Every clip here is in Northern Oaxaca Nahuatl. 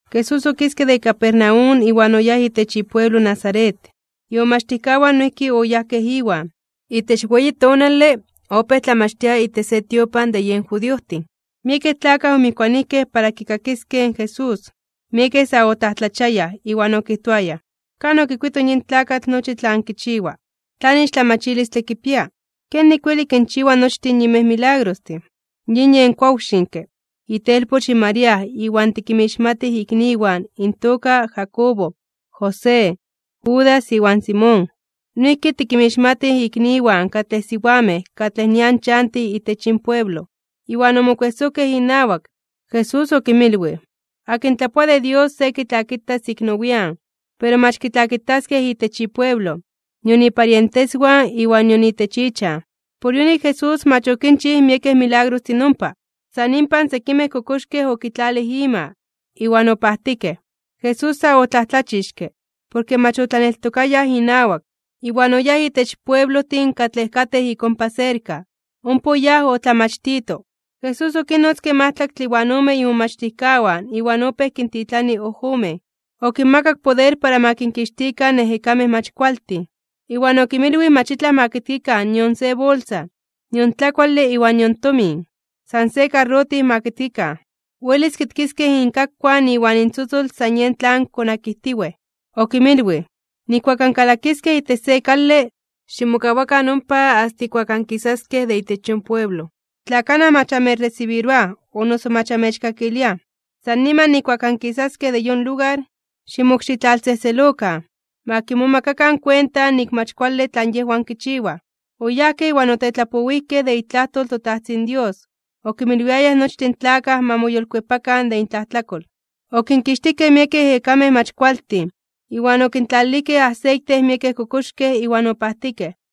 Jesús okiske de Capernaum iwan oyáj itech ipueblo Nazaret. Imomachtijkawan noijki oyajkej Iwan. Itech weyi tonale, opéj tlamachtia itech se tiopan de yen judiojtin, miekej tlakaj omijkuanijkej para kikakiskej in Jesús. Miekej sa otlajtlachiayaj (omomajmawtiayaj) iwan okijtoayaj: ―¿Kan okuito yin tlakatl nochi tlan kichiwa, tlan ixtlamachilistle kipia? ¿Kenik weli kinchiwa nochtin yinmej milagrostin? Yin yen kuawtlaxinke, itelpoch in María iwan tikinmixmatij ikniwan intoka Jacobo, José, Judas iwan Simón. Noijki tikinmixmatij ikniwan katlej siwamej katlej nian chantij itech yin pueblo. Iwan omokuejsojkej inawak. Jesús okinmilwij: ―Akin tlapoa de Dios se kitlakitas ik nowian (nian nepa), pero mach kitlakitaskej itech ipueblo, nion iparienteswan iwan nion itech ichan. Por yonik Jesús mach okinchij miekej milagrostin ompa. San inpan sekimej kokoxkej okitlalij ima, iwan opajtikej. Jesús sa otlajtlachixke (omomajmawtij) porke mach otlaneltokayaj inawak. Iwan oyáj itech pueblojtin katlej katej ik ompa serka, ompa oyáj otlamachtito. Jesús okinnotzke majtlaktle iwan ome imomachtijkawan iwan opéj kintitlani ojomen. Okinmakak poder para ma kinkixtikan ejekamej mach kualtin. Iwan okinmilwij mach itlaj ma kitkikan nion se bolsa, nion tlakuale iwan nion tomin, san se karrotij ma kitkikan. Welis kitkiskej inkakuan iwan intzotzol san yej tlan konakijtiwej. Okinmilwij: ―Nijkuak ankalakiskej itech se kale, ximokawakan ompa asta ijkuak ankisaskej de itech yon pueblo. Tla kanaj mach amechresibiroaj o noso mach amechkakiliaj, san niman nijkuak ankisaskej de yon lugar, ximokxitlaltzejtzelokan. Ma kimomakakan kuenta nik mach kuale tlan yejwan kichiwaj. Oyajkej iwan otetlapowijkej de itlajtol in toTajtzin Dios, okinmilwiayaj nochtin tlakaj ma moyolkuepakan de intlajtlakol. Okinkixtijkej miekej ejekamej mach kualtin, iwan okintlalilijkej aseite miekej kokoxkej iwan opajtikej.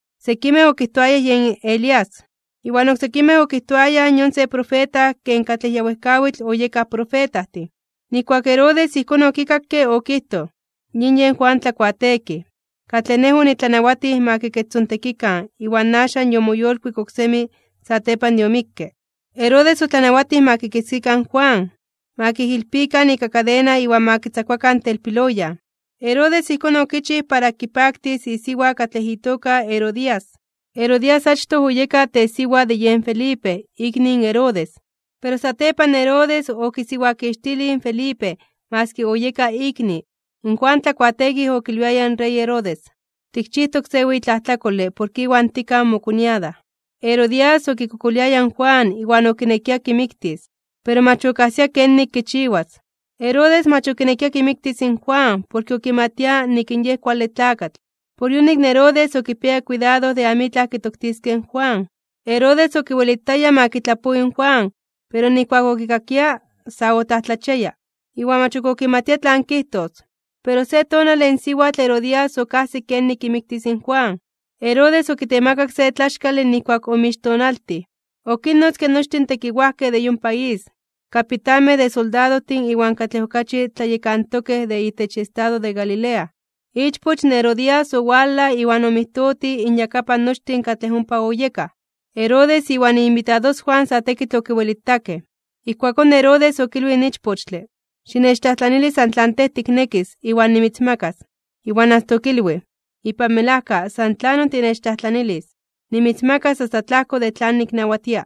Oksekimej okijtoayaj: ―Yon yen profeta Elías. Iwan oksekimej okijtoayaj: ―Yon se profeta ken katlej ya wejkawitl oyekaj profetajtin. Nijkuak in Herodes ijkón okikakke okijtoj: ―Yin yen Juan Tlakuateekij, katlej nej onitlanawatij ma kikechtzontekikan iwan axan yomoyolkuik oksemi satepan de omikke. Herodes otlanawatij ma kikitzkikan in Juan, ma kijilpikan ika kadena iwan ma kitzakuakan telpiloyan. Herodes ijkón okichij para kipaktis isiwa katlej itoka Herodías. Herodías achtoj oyeka tesiwa de yen Felipe ikni in Herodes, pero satepan Herodes okisiwakixtilij in Felipe maski oyeka ikni. In Juan Tlakuateekij okilwiaya in rey Herodes: ―Tikchijtok se weyi tlajtlakole porke iwan tikaj mokoñada. Herodías okikokoliaya in Juan iwan okinekia kimiktis. Pero mach okajsia kenik kichiwas. Herodes mach okinekia kimiktis in Juan porke okimatia nik in yej kuale tlakatl, por yonik Herodes okipiaya kuidado de amitlaj kitoktiskej in Juan. Herodes okiwelitaya ma kitlapowi in Juan, pero nijkuak okikakia, sa otlajtlachiaya (omomajmawtiaya) iwan mach ok okimatia tlan kijtos. Pero se tonale in siwatl Herodías okajsik kenik kimiktis in Juan. Herodes okitemakak se tlaxkale nijkuak omixtonaltij (ikumpleaños). Okinnotzke nochtin tekiwajkej de yon país, kapitanmej de soldadojtin iwan katlej okachi tlatlayekantokej de itech estado de Galilea. Ichpoch in Herodías owalaj iwan omijtotij inyakapan nochtin katlej ompa oyekaj. Herodes iwan iinbitadoswan sa tekitl okiwelitakej. Ijkuakón Herodes okilwij in ichpochtle: ―Xinechtlajtlanili san tlan tej tiknekis iwan nimitzmakas. Iwan asta okilwij: ―Ipan melajka, san tlanon tinechtlajtlanilis, nimitzmakas asta tlajko de tlan niknawatia.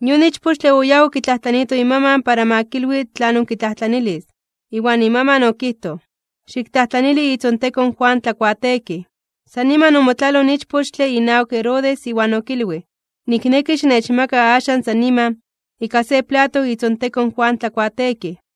Yon ichpochtle oyáj okitlajtlaniito imaman para ma kilwi tlanon kitlajtlanilis. Iwan imaman okijtoj: ―Xiktlajtlanili itzontekon in Juan Tlakuateekij. San niman omotlaloj in ichpochtle inawak Herodes iwan okilwij: ―Nikneki xinechmaka axan san niman, ika se plato itzontekon in Juan Tlakuateekij.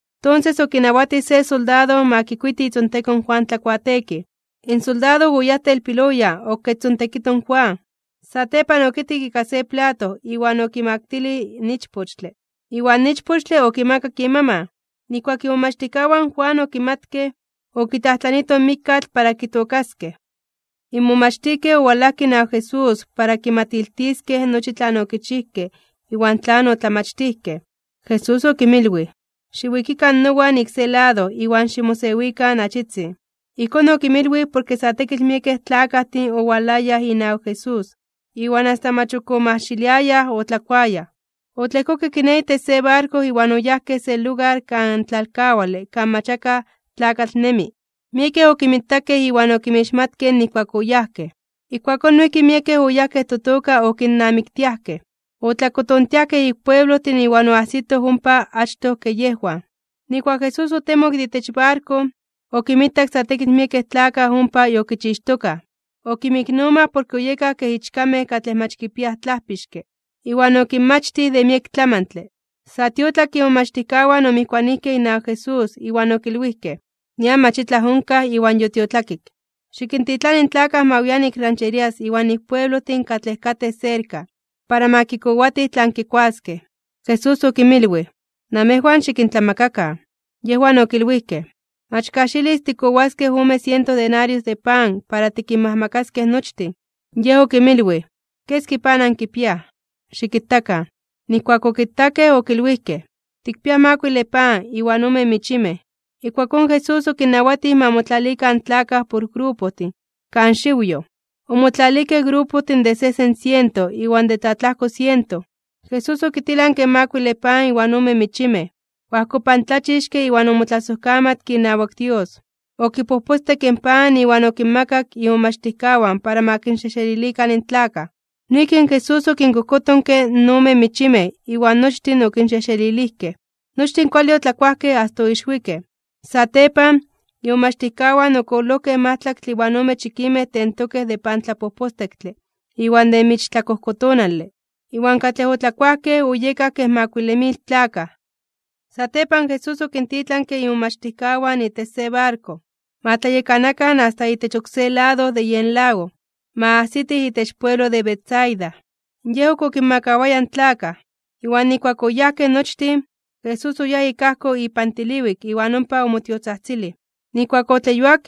Tonses okinawatij se soldado ma kikuiti itzontekon in Juan Tlakuateekij. In soldado oyáj telpiloyan okechtzontekito in Juan. Satepan okitkik ika se plato iwan okimaktilij in ichpochtle. Iwan ichpochtle okimakak imaman. Nijkuak imomachtijkawan in Juan okimatkej, okitlajtlanitoj in mikkatl para kitookaskej. In momachtijkej owalajkej inawak Jesús para kimatiltiskej nochi tlan okichijkej iwan tlan otlamachtijkej. Jesús okinmilwij: ―Xiwikikan nowan ik se lado iwan ximosewikan achitzin. Ijkón okinmilwij porke sa tekitl miekej tlakajtin owalayaj inawak Jesús, iwan asta mach ok omajxiliayaj otlakuayaj. Otlejkokej kiné itech se barko iwan oyajkej se lugar kan tlalkawale kan mach akaj tlakatl nemi. Miekej okinmitakej iwan okinmixmatkej nijkuak oyajkej, ijkuakón noijki miekej oyajkej totoka okinnamiktiajkej, otlakotontiajkej ik pueblojtin iwan oajsitoj ompa achtoj ke yejwan. Nijkuak Jesús otemok de itech barko, okinmitak sa tekitl miekej tlakaj ompa yokichixtokaj, okinmiknomaj porke oyekaj kej ichkamej katlej mach kipiaj tlajpixke. Iwan okinmachtij de miek tlamantle. Sa tiotlakke imomachtijkawan omijkuanijkej inawak Jesús iwan okilwijkej: ―Nian mach itlaj onkaj iwan yotiotlakik. Xikintitlani in tlakaj ma wian ik rancherías iwan ik pueblojtin katlej katej serka, para ma kikowatij tlan kikuaskej. Jesús okinmilwij: ―Namejwan xikintlamakakan. Yejwan okilwijkej: ―Mach kajxilis tikkowaskej ome siento denarios de pan para tikinmajmakaskej nochtin. Yej okinmilwij: ―¿Keski pan ankipiaj? Xikitakan. Nijkuak okitakej, okilwijkej: ―Tikpiaj makuile pan iwan ome michimej. Ijkuakón Jesús okinnawatij ma motlalikan in tlakaj por grupojtin, kan xiwyoj. Omotlalijkej grupojtin de sejsen siento iwan de tlatlajko siento. Jesús okitilanke in makuile pan iwan ome michimej, oajkopantlachixke iwan omotlasojkamatke inawak Dios. Okipojpostekke in pan iwan okinmakak imomachtijkawan para ma kinxejxelilikan in tlakaj. Noijki Jesús okinkojkotonke in ome michimej iwan nochtin okinxejxelilijkej. Nochtin kuale otlakuajkej asta oixwikej. Satepan, imomachtijkawan okololojkej majtlaktle iwan ome chikimej tentokej de pantlapojpostektle iwan de michtlakojkotonale. Iwan katlej otlakuajkej oyekaj kej makuile mil tlakaj. Satepan, Jesús okintitlanke imomachtijkawan itech se barko, ma tlayekanakan asta itech oksé lado de yen lago, ma ajsitij itech pueblo de Betsaida. Yej ok okinmakawaya in tlakaj. Iwan nijkuak oyajkej nochtin, Jesús oyáj ik ajko ipan tiliwik iwan ompa omotiotzajtzilij. Nijkuak otleyuak,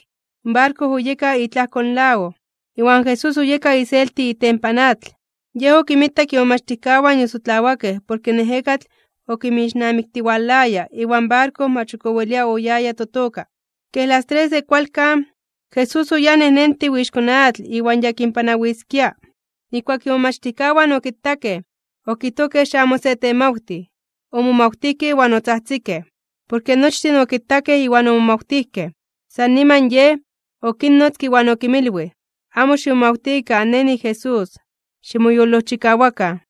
in barko oyeka itlajko in lago, iwan Jesús oyeka iselti itempan atl. Yej okinmitak imomachtijkawan yosotlawakej porke in ejekatl okinmixnamiktiwalaya iwan barko mach ok owelia oyaya totoka. Kej las tres de kualkan, Jesús oyáj nejnentiw ixko atl iwan ya kinpanawiskia. Nijkuak imomachtijkawan okitakej, okijtojkej xamo se temawtij, omomawtijkej iwan otzajtzikej. Porke nochtin okitakej iwan omomawtijkej. San niman Yej, okinnotzke iwan okinmilwij: ―Amo ximomawtikan, Nej niJesús. Ximoyolojchikawakan.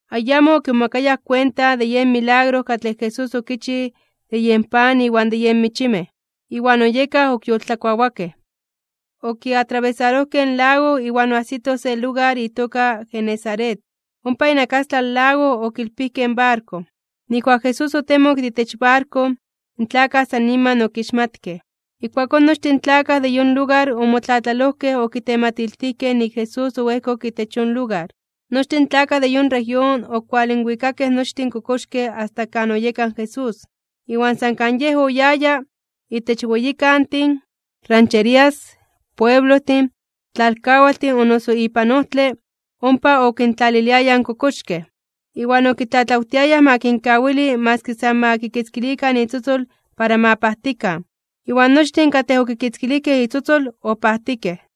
Ayamo okimomakayaj kuenta de yen milagro katlej Jesús okichij de yen pan iwan de yen michimej, iwan oyekaj ok yoltlakuawakej. Okiatrabesarojkej in lago iwan oajsitoj se lugar itoka Genesaret. Ompa inakastlan lago okilpijkej in barko. Nijkuak Jesús otemok de itech barko, in tlakaj san niman okixmatkej. Ijkuakón nochtin tlakaj de yon lugar omotlatlalojkej okitematiltijkej nik in Jesús oejkok itech yon lugar. Nochtin tlakaj de yon región okualinwikakej nochtin kokoxkej asta kan oyeka in Jesús. Iwan san kan Yej oyaya, itech weyikantin, rancherías, pueblojtin, tlalkawaltin o noso ipan ojtle, ompa okintlaliliayaj in kokoxkej, iwan okitlatlawtiayaj ma kinkawili maski san ma kikitzkilikan itzotzol para ma pajtikan. Iwan nochtin katlej okikitzkilijkej itzotzol opajtikej.